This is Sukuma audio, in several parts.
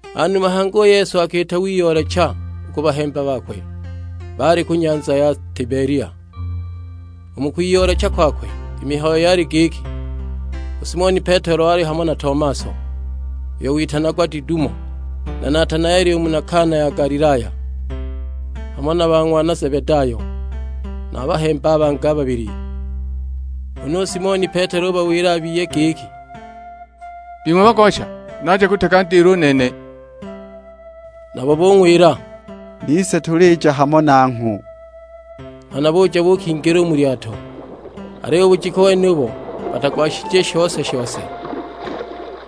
Hanuma hangi u Yesu akiita wiyoolecha u ku bahemba bakwe baali ku nyanza ya Tibelia. U mu kwiyoolecha kwakwe i mihayo yali giki: u Simoni Petelo wali hamo na Tomaso, uyo witanagwa Didumo, na Natanaeli u muna Kana ya Galilaya; hamo na ba ng'wana Zebedayo, na bahemba bangi babili. Huna u Simoni Petelo ubawila a biye giki, "Bing'we bagosha, naja kutega ndilo u nene." Nabo bung'wila, "Nise tulija hamo nangho!" Nghana buja buukingila mu lyato. Aliyo u bujiku wenubo batagwashije shose-shose.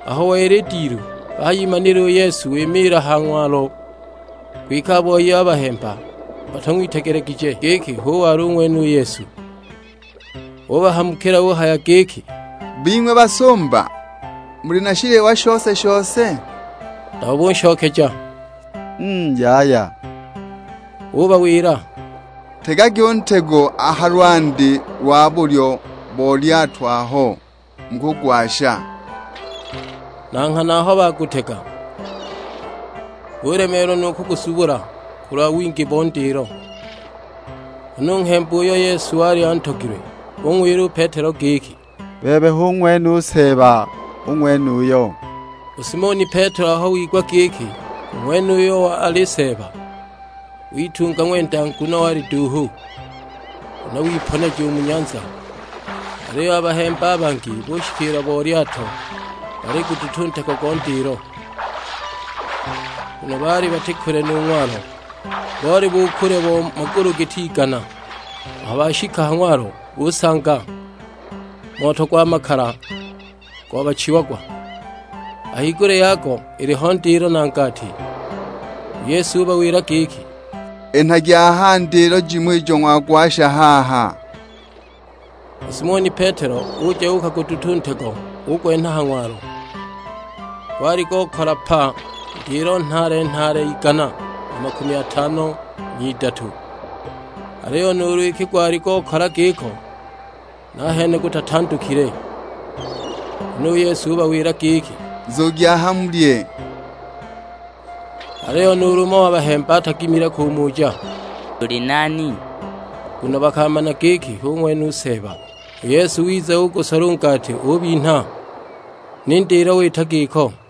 Aho wela i dilu, bahayimanila u Yesu wimiila a ha ng'walo; kwike a boi a bahemba batang'witegelegije giki hu wali ng'wene u Yesu. Ubahamukila uhaya giki, "Bing'we basumba, muli na shiliwa shose-shose?" Nabo bunshokeja, "Mm yaya!" Ubawila, "Tegagi u ntego a ha lwandi lwa bulyo bo lyato aho, mukugwasha!" Na nghana aho bagutega, bulemeelwa nu kuguzubula kulwa wingi bo ndilo. Huna u nghemba uyo Yesu wali antogilwe ung'wila u Petelo giki, "Bebe hu ng'wene u Seeba u ng'wenuyo!" U Simoni Petelo aho wigwa giki u ng'wenuyo wali Seeba, witunga ng'wenda; nguno wali duuhu, huna wiponeja mu nyanza. Aliyo a bahemba a bangi bushikiila bo lyato baliguduta u ntego go ndilo, nguno baali bati kule nu ng'walo. Boli bu kule bo magulu giti igana. Aho bashika a ha ng'walo busanga moto gwa makala gobachiagwa, a higulya yago iliho ndilo na ngati. U Yesu ubawila giki, "Enhagi aha ndilo jimo ijo ng'wagwasha haha." U Simoni Petelo uja uukaguduta u ntego ugwenha ha ng'walo; gwali gokala pa, ndilo nhaale-nhaale igana na makumi atano n'idatu. Aliyo nuulu iki gwali gokala giko, nahene gutatandukile! Huna u Yesu ubawila giki, "Nzugi aha mulye." Aliyo nuulu umo wa bahemba atagimile kumuja, "Uli nani?" Nguno bakamana giki hu ng'wene u Seeba. U Yesu wiza ugusola u ngati ubinha; ni ndilo wita giko.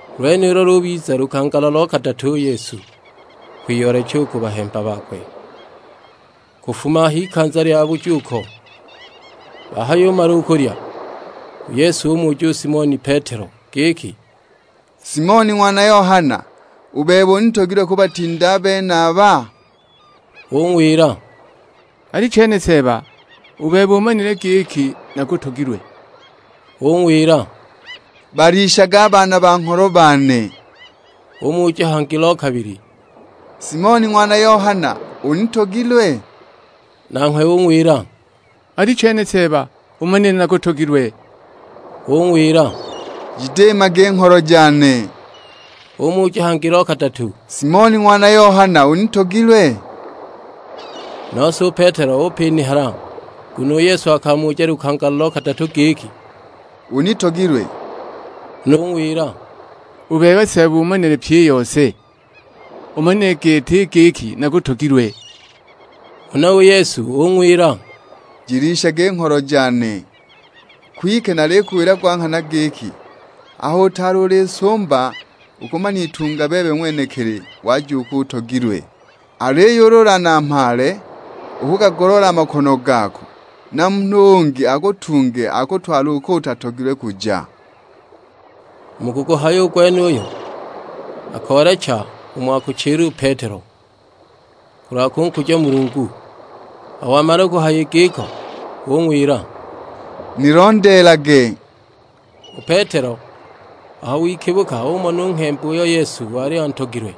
U lwenulo lubiza lukangala lo kadatu u Yesu kwiyoolecha u ku bahemba bakwe kufuma a h'ikanza lya bujuuko. Bahayumala u kulya, u Yesu umuja u Simoni Petelo giki, "Simoni ng'wana Yohana, u bebe unitogilwe kubatinda a benaba?" Ung'wila, "Alichene Seeba; u bebe umanile giki nakutogilwe." Ung'wila, "Balishage a baana ba ngholo bane." Umuja hangi lo kabili, "Simoni ng'wana Yohana, unitogilwe?" Nanghwe ung'wila, "Alichene Seeba; umanile nakutogilwe." Ung'wila "Jidiimage i ngholo jane." Umuja hangi lo kadatu, "Simoni ng'wana Yohana, unitogilwe?" Nose u Petelo upinihala, nguno u Yesu akamuja lukangala lo kadatu giki, "Unitogilwe?" Na ung'wila, "U bebe Seeba umanile pyi i yose, umanile gete i giki nakutogilwe." Huna u Yesu ung'wila, "Jilishage i ngholo jane. Kwike nalikuwila gwa nghana giki, aho utaali uli nsumba ukumanitunga bebe ng'wenekili waja uko utogelilwe. Aliyo ulu ulanamhaale, ukugagoloola a makono gako, na munhu ungi akutunge akutwale uko utatogilwe kuja." U mukuguhaya u gwenuyo, akoolecha umo akuchila u Petelo, kulwa kunkuja Mulungu. Aho wamala kuhaya giko ung'wila; "Nilondeelage." U Petelo aho wikibuka umona u nghemba uyo Yesu wali antogilwe,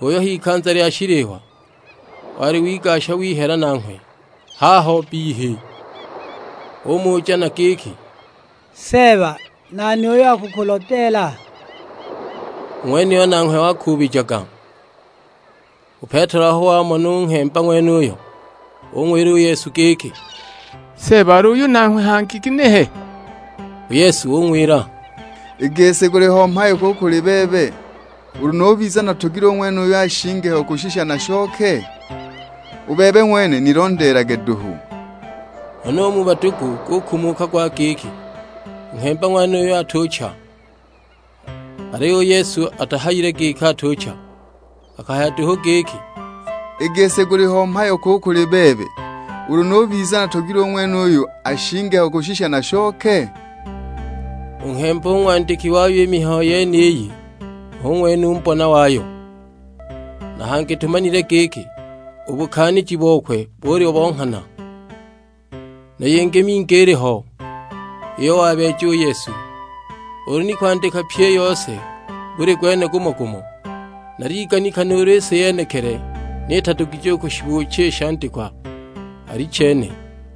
uyo h'ikanza lya shiliwa wali wigasha wihela nanghwe haho bbihi; umuja na giki, "Seeba nani uyo akukulodeela?" U ng'wenuyo nanghwe wakuubijaga. U Petelo aho wamona u nghemba ng'wenuyo ung'wila u Yesu giki, "Seeba al'uyu nanghwe hangi ginehe?" U Yesu ung'wila "I gisi guliho mhayo ki u kuli bebe, ulu nubiza natogilwe u ng'wenuyu ashinge ho kushisha nashoke? U bebe ng'wene nilondeelage duhu!" Huna u mu badugu gukumuka gwa giki u nghemba ng'wenuyo atucha! Aliyo u Yesu atahayile giki atucha. Akahaya duhu giki, "I gisi guliho mhayo ki u kuli bebe, ulu nubiza natogilwe u ng'wenuyu ashinge ho kushisha nashoke?" U nghemba u ng'wandiki wayo i mihayo yeniyi hu ng'wene u mbona wayo, na hangi tumanile giki u bukaaniji bokwe buli bo nghana. Na yingi mingi iliho iyo wabeeja u Yesu; ulu ni kwandikwa pyi i yose buli gwene gumo-gumo, naliganika nuulu i si yenekili ni itadugije u kushibuucha i shandikwa: Alichene!